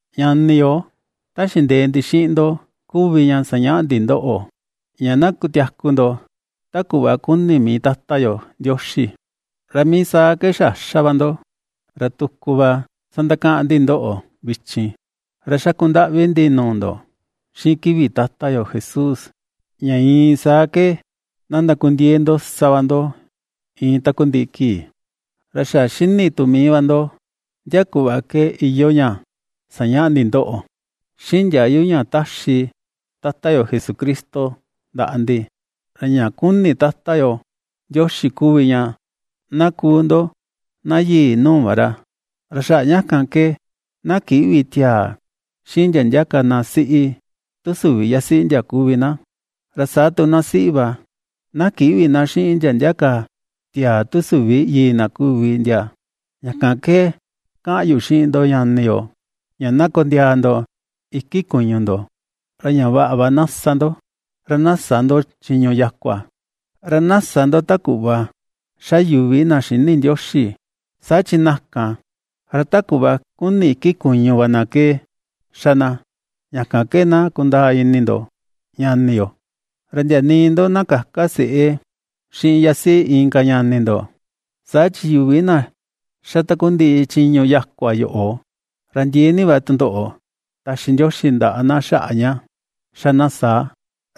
Ñani yo, ta xindee ndi xiꞌin ndo kuvi ña sañaꞌa ndi ndoꞌo, ña na kutiaku ndo ta kuꞌva kuni mii Tata yo Ndioxi, ra mii saa ke xa ^xa va ndo, ra tuku va sandakaꞌan ndi ndoꞌo vichin, ra xaku ndaꞌvi ndi nuu ndo xiꞌin kivi Tata yo Jesús, ña iin saa ke na ndakundiee ndo sa va ndo, iin takundiꞌi kii. Ra xa ^xini tu mii va ndo, ndia kuꞌva ke iyoo ña sañaꞌa ndi ndoꞌo, xiꞌin ndiayu ña ^taxi Tata yo Jesucristo ndaꞌa ndi. Ra ña kuni Tata yo Ndioxi kuvi ña na kuu ndo na yii nuu va ra, ra xaꞌa ña kan ke na kïꞌvi tiaa xiꞌin ndia ndia ka na siꞌi tu süvi yasiꞌi ndia kuvi na, ra saa tu na siꞌi va, na kïꞌvi na xiꞌin ndia ndia ka tiaa tu süvi yii na kuvi ndia. Ña kan ke kaꞌan yu xiꞌin ndo ñani yo, ña na kondiaa ndo iki kuñu ndo, ra ña vaꞌa va na sa ndo, ra na sä ndo chiñu yakua, ra na sä ndo ta kuꞌva ^xa yuvi na xïni Ndioxi, saa chi na kan, ra ta kuꞌva kuni iki kuñu va na ke ^xa na. Ña kan ke na kundaa ini ndo ñani yo, ra ndia nii ndo na käka seꞌé xiꞌin yasiꞌi inka ñani ndo, saa chi yuvi na xa takundiꞌi chiñu yakua yoꞌo, ra ndiee ni va tundoꞌo taxi Ndioxi ndaꞌa na xaꞌa ña ^xa na saa,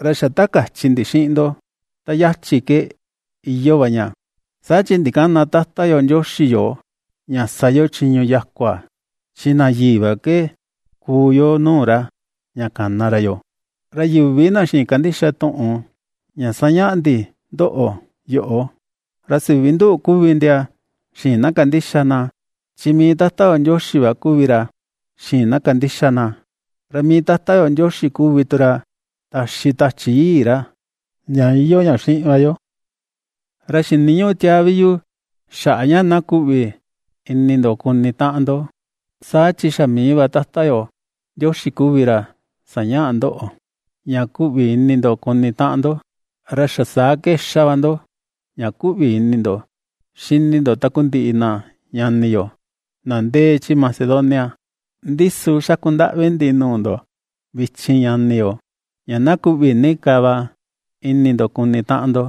ra xa ta kachi ndi xiꞌin ndo ta yachi ke iyoo va ña. Saa chi ndikäna Tata yo Ndioxi yoo, ña sa yo chiñu yakua, chi na yii va ke kuu yo nuu ra, ña kana ra yoo. Ra yuvi na xïin kandixa tuꞌun ña ^sañaꞌa ndi ndoꞌo yoꞌo, ra süvi nduꞌu kuvi ndia xïin na kandixa na, chi mii Tata yo Ndioxi va kuvi ra, xïin na kandixa na. Ra mii Tata yo Ndioxi kuvi tu ra taxi Tachi Yii ra, ña iyoo ña xiꞌin va yo. Ra xiniñüꞌu tiaa vi yu xaꞌa ña na kuꞌvi ini ndo kuni taꞌan ndo, saa chi xa mii va Tata yo Ndioxi kuvi ra sañaꞌa ndoꞌo, ña kuꞌvi ini ndo kuni taꞌan ndo. Ra xa saa ke ^xa va ndo ña kuꞌvi ini ndo xini ndo takundiꞌi na ñani yo na ndee chi Macedonia. Ndi su xaku ndaꞌvi ndi nuu ndo vichin ñani yo, ña na kuꞌvi ni ka va ini ndo kuni taꞌan ndo.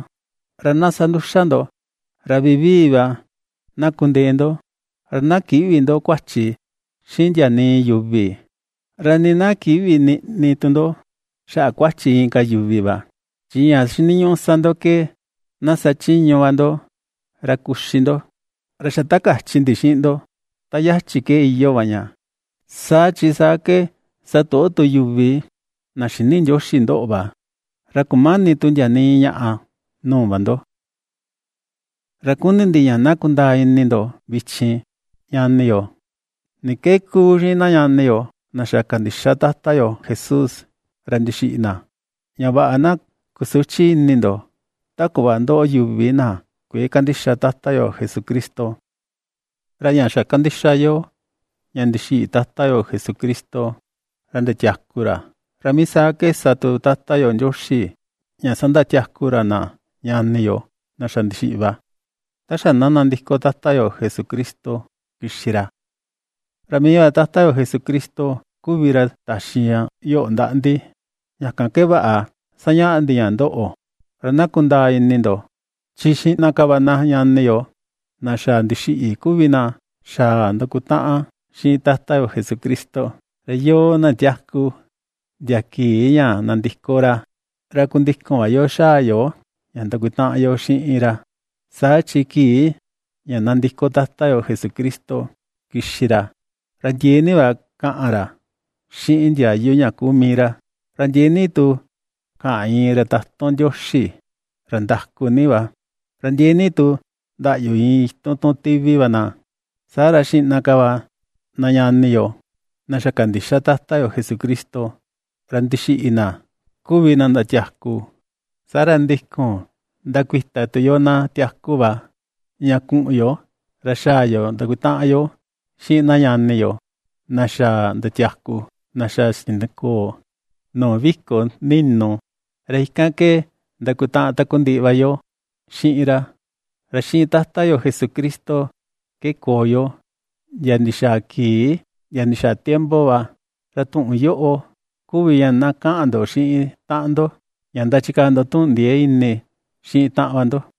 Ra na sa nduxa ndo, ra vivii va na kundee ndo, ra na kïꞌvi ndo kuachi xiꞌin ndia nii yuvi, ra nii na kïꞌvi niꞌni tu ndo xaꞌa kuachi inka yuvi va, chi ña xiniñuꞌu sa ndo ke na sachiñu va ndo ra kuxi ndo, ra xa ta kachi ndi xiꞌin ndo ta yachi ke iyoo va ña. Saa chi, saa ke satoꞌo tu yuvi na xïni Ndioxi ndoꞌo va, ra kumäni tu ndia nii ñaꞌa nuu va ndo. Ra kuni ndi ña na kundaa ini ndo vichin, ñani yo, ni ke ^kuu xiꞌin na ñani yo na xa kandixa Tata yo Jesús, ra ndixiꞌi na, ña vaꞌa na kusüchi ini ndo, ta kuꞌva ^ndoꞌo yuvi na kuëe kandixa Tata yo Jesucristo. Ra ña xa kandixa yo ña ndixiꞌi Tata yo Jesucristo, ra ndiatiaku ra, ra mii saa ke sa tu Tata yo Ndioxi ña sandatiaku ra na ñani yo na xa ndixiꞌi va, ta xa na nandiko Tata yo Jesucristo kixi ra. Ra mii va Tata yo Jesucristo kuvi ra taxi ña yoꞌo ndaꞌa ndi, ña kan ke vaꞌa ^sañaꞌa ndi ña ndoꞌo, ra na kundaa ini ndo, chi xiꞌna ka va na ñani yo na xa ndixiꞌi kuvi na xaa ndakutaꞌan xiꞌin Tata yo Jesucristo, ra yoo, na tiaku, ndia kii ña nandiko ra, ra kundikun va yo xaa yo ña ndakutaꞌan yo xiꞌin ra. Saa chi kii ña nandiko Tata yo Jesucristo kixi ra, ra ndiee ni va kaꞌan ra xiꞌin ndiayu ña kuu mii ra, ra ndiee ni tu kaꞌan iin ra tatun Ndioxi ra ndaku ni va, ra ndiee ni tu ndaꞌyu iin itun tun tivi va na. Saa ra xiꞌna ka va na ñani yo, na xa kandixa Tata yo Jesucristo, ra ndixiꞌi na kuvi na ndatiaku. Saa ra ndikun, ndakuita tu yoo, na tiaku va, ña kuꞌun yo, ra xaa yo ndakutaꞌan yo xiꞌin na ñani yo, na xa ndatiaku, na xa xinikoo nuu viko ninu, ra ikan ke ndakutaꞌan takundiꞌi va yo xiꞌin ra. Ra xiꞌin Tata yo Jesucristo ke koo yo, ndia ndixaa kii ndia ndixaa tiempo va. Ra tuꞌun yoꞌo kuvi ña na kaꞌan ndo xiꞌin taꞌan ndo, ña ndachikaa ndo tuꞌun ndiee ini xiꞌin taꞌan va ndo.